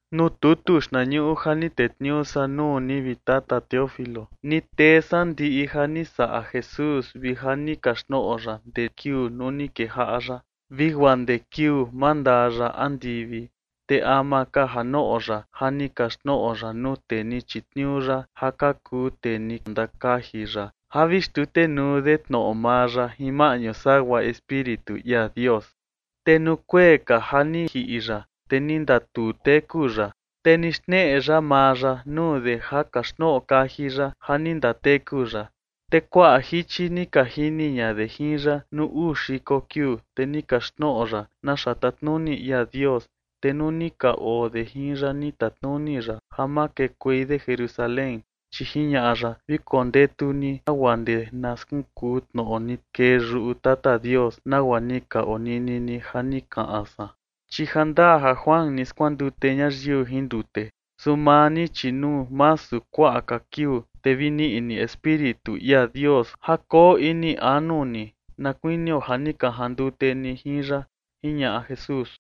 Nuu tutu xtnañuꞌu ja ni tetniuu san nuu ni, vi Tata Teófilo, ni tee san ndiꞌi ja ni saꞌa Jesús vi ja ni kaxtnoꞌo ya ndee kiuu nuu ni kejaꞌa ya vi guaa ndee kiuu mandaa ya andivi. Te ama ka ja noꞌo ya, ja ni kaxtnoꞌo ya nuu tee ni chitniuu ya ja ka kuu tee ni ndakaji ya ja vi xtutenuu de tnoꞌo maa ya jin maꞌñu sagua Espíritu ia Dios. Te nuu kuee ka ja ni jiꞌi ya, te ni ndatuu teku ya, te ni xneꞌe ya maa ya nuu de ja kaxtnoꞌo kaji ya ja ni ndateku ya. Te kuaꞌa jichi ni ka jini ña de jin ya nuu uu xiko kiuu. Te ni kaxtnoꞌo ya naxa tatnuni ia Dios. Te nuu ni ka oo de jin ya ni tatnuni ya ja ma kekuei de Jerusalén, chi jiñaꞌa ya: ―Vi kondetu ni guaa ndee na skunkuu tnoꞌo ni kee yuꞌu Tata Dios, nagua ni ka onini ni ja ni kaꞌan san, chi ja ndaa ja Juan ni skuandute ñayiu jin ndute, su maa ni, chi nuu masu kuaꞌa ka kiuu, te vi niꞌi ni Espíritu ia Dios ja koo ini anu ni, na kuinio ja ni ka jandute ni jin ya ―jiñaꞌa Jesús.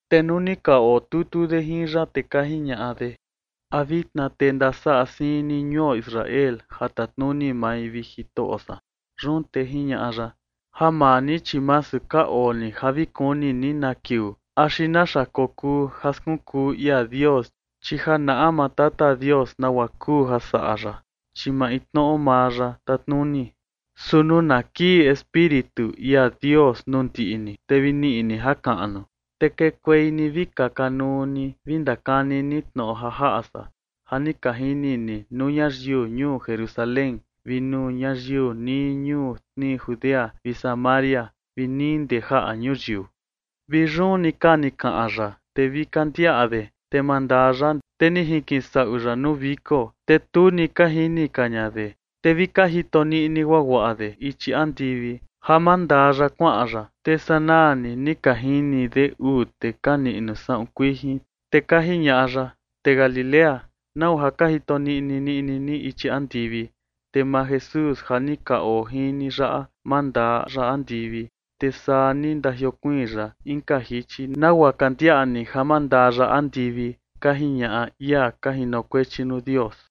Te nuu ni ka otutu de jin ya, te ka jiñaꞌa de: ―¿A vitna te ndasaꞌa siin ni ñuo Israel ja tatnuni mai, vi Jitoꞌo san? Yun te jiñaꞌa ya: ―Ja maa ni, chi masu ka oo ni ja vi kuni ni na kiuu axi naxa kokuu ja skunkuu ia Dios, chi ja naꞌa maa Tata Dios nagua kuu ja saꞌa ya, chi maintnoꞌo maa ya tatnuni. Su nuu na kii Espíritu ia Dios nuu ndiꞌi ni, te vi niꞌi ni jakaꞌnu, te kekuei ni vi kaka nuu ni vi ndakani ni tnoꞌo ja jaꞌa san ja ni ka jini ni nuu ñayiu ñuu Jerusalén vi nuu ñayiu nii ñuu tnii Judea vi Samaria vi nii ndee jaꞌa ñuyiu. Vi yun ni ka ni kaꞌan ya, te vi ka ndiaꞌa de, te mandaa ya, te ni jinkisaꞌu ya nuu viko, te tu ni ka jini ka ña de. Te vi ka jito niꞌni guaguaꞌa de ichi andivi ja mandaa ya kuaꞌan ya, te sanaa ni ni ka jini de uu tee ka niꞌnu saꞌun kuijin. Te ka jiñaꞌa ya: ―Tee Galilea, ¿nau ja ka jito niꞌni niꞌni ni ichi andivi? Te maa Jesús ja ni ka oo jin ni yaꞌa, mandaa ya andivi, te saa ni ndajiokuiin ya inka jichi nagua ka ndiaꞌa ni ja mandaa ya andivi ―ka jiñaꞌa ia ka jinokuechi nuu Dios.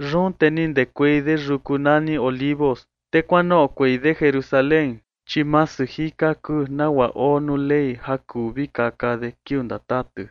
Yun te ni ndekuei de yuku nani Olivos, te kuanoꞌokuei de Jerusalén, chi masu jika kuu nagua oo nuu Ley ja kuu vi kaka de kiuu ndatatu.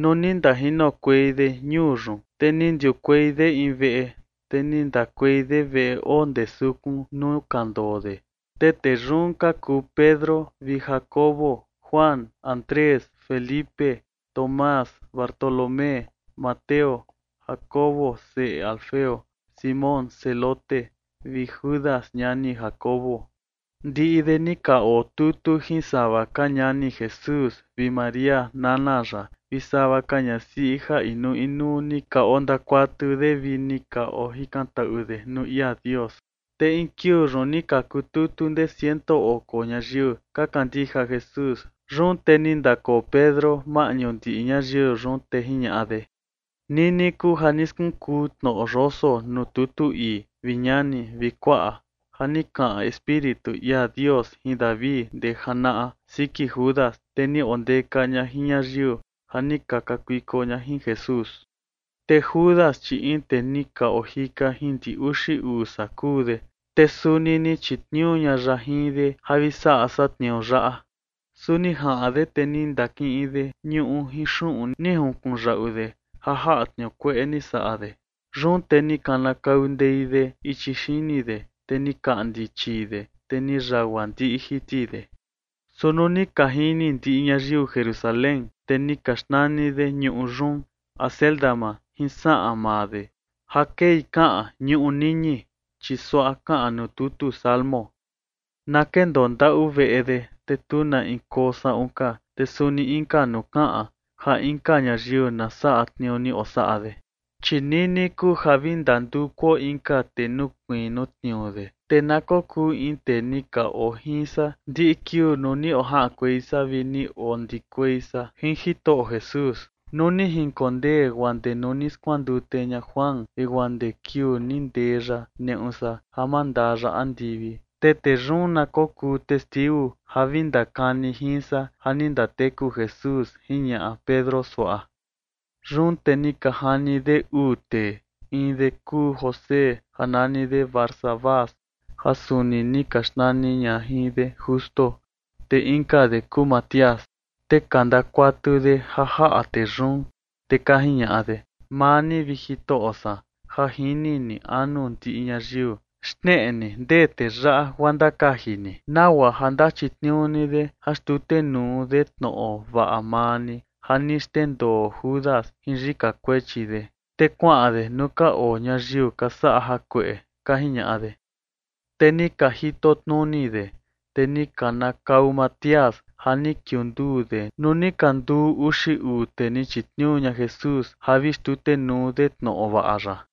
Nuu ni ndajinokuei de ñuu yun, te ni ndiukuei de in veꞌe, te ni ndakuei de veꞌe oo ndee sukun nuu ka ndoo de. Te tee yun ka kuu Pedro vi Jacobo, Juan, Andrés, Felipe, Tomás, Bartolomé, Mateo, Jacobo seꞌe Alfeo, Simón Zelote vi Judas ñani Jacobo. Ndiꞌi de ni ka otutu jin sava ka ñani Jesús vi María, nana ya, vi sava ka ñasiꞌi ja inuu inuu ni ka ondakuatu de vi ni ka ojikantaꞌu de nuu ia Dios. Te in kiuu yun ni ka kututu ndee ciento oko ñayiu ka kandija Jesús. Yun te ni ndakoo Pedro maꞌñu ndiꞌi ñayiu yun, te jiñaꞌa de: ―Nini kuu ja ni skunkuu tnoꞌo yoso nuu tutu ii, vi ñani vi kuaꞌa, ja ni kaꞌan Espíritu ia Dios jin David ndee janaꞌa siki Judas, tee ni ondeka ña jin ñayiu ja ni ka kakuiko ña jin Jesús. Te Judas, chi in tee ni ka ojika jin ndi uxi uu san kuu de, te suni ni chitniuu ña ya jin de ja vi saꞌa san tniuu yaꞌa. Su ni jaꞌan de, te ni ndakiꞌin de ñuꞌu jin xuꞌun ni junkunyaꞌu de ja jaꞌa tniuu kueꞌe ni saꞌa de. Yun te ni kanakau ndei de ichi xini de, te ni kaꞌndi chii de, te ni yagua ndiꞌi jiti de. Su nuu ni ka jini ndiꞌi ñayiu Jerusalén, te ni ka xnani de ñuꞌu yun Acéldama, jin saꞌan maa de, ja kei kaꞌan ñuꞌu niñi. Chi suaꞌa kaꞌan nuu tutu Salmo: Na kendoo ndaꞌu veꞌe de te tu na in koo saꞌun ka. Te suni inka nuu kaꞌan: Ja inka ñayiu na saꞌa tniuu ni osaꞌa de. ’Chi nini kuu ja vi ndandukuo inka tee nukuiin nuu tniuu de, te na kokuu in tee ni ka oo jin san ndiꞌi kiuu nuu ni ojaꞌankuei san vi ni ondikuei san jin Jitoꞌo Jesús, nuu ni jinkondee guaa ndee nuu ni skuandute ña Juan vi guaa ndee kiuu ni ndee ya neꞌu san ja mandaa ya andivi. Te tee yun na kokuu testiu ja vi ndakani jin san ja ni ndateku Jesús ―jiñaꞌa Pedro suaꞌa. Yun te ni ka jani de uu tee, in de kuu José ja nani de Barsabás ja suni ni ka xnani ña jin de Justo, te inka de kuu Matías. Te ka ndakuatu de ja jaꞌa tee yun, te ka jiñaꞌa de: ―Maa ni, vi Jitoꞌo san, ja jini ni anu ndiꞌi ñayiu, xneꞌe ni ndee tee yaꞌa guaa ndakaji ni, nagua ja ndachitniuu ni de ja xtutenuu de tnoꞌo vaꞌa maa ni ja ni xndendoo Judas jin yika kuechi de, te kuaꞌan de nuu ka oo ñayiu ka saꞌa jakueꞌe ―ka jiñaꞌa de. Te ni ka jitotnuni de, te ni kanakau Matías ja ni kiunduu de nuu ni ka nduu uxi uu tee ni chitniuu ña Jesús ja vi xtutenuu de tnoꞌo vaꞌa ya.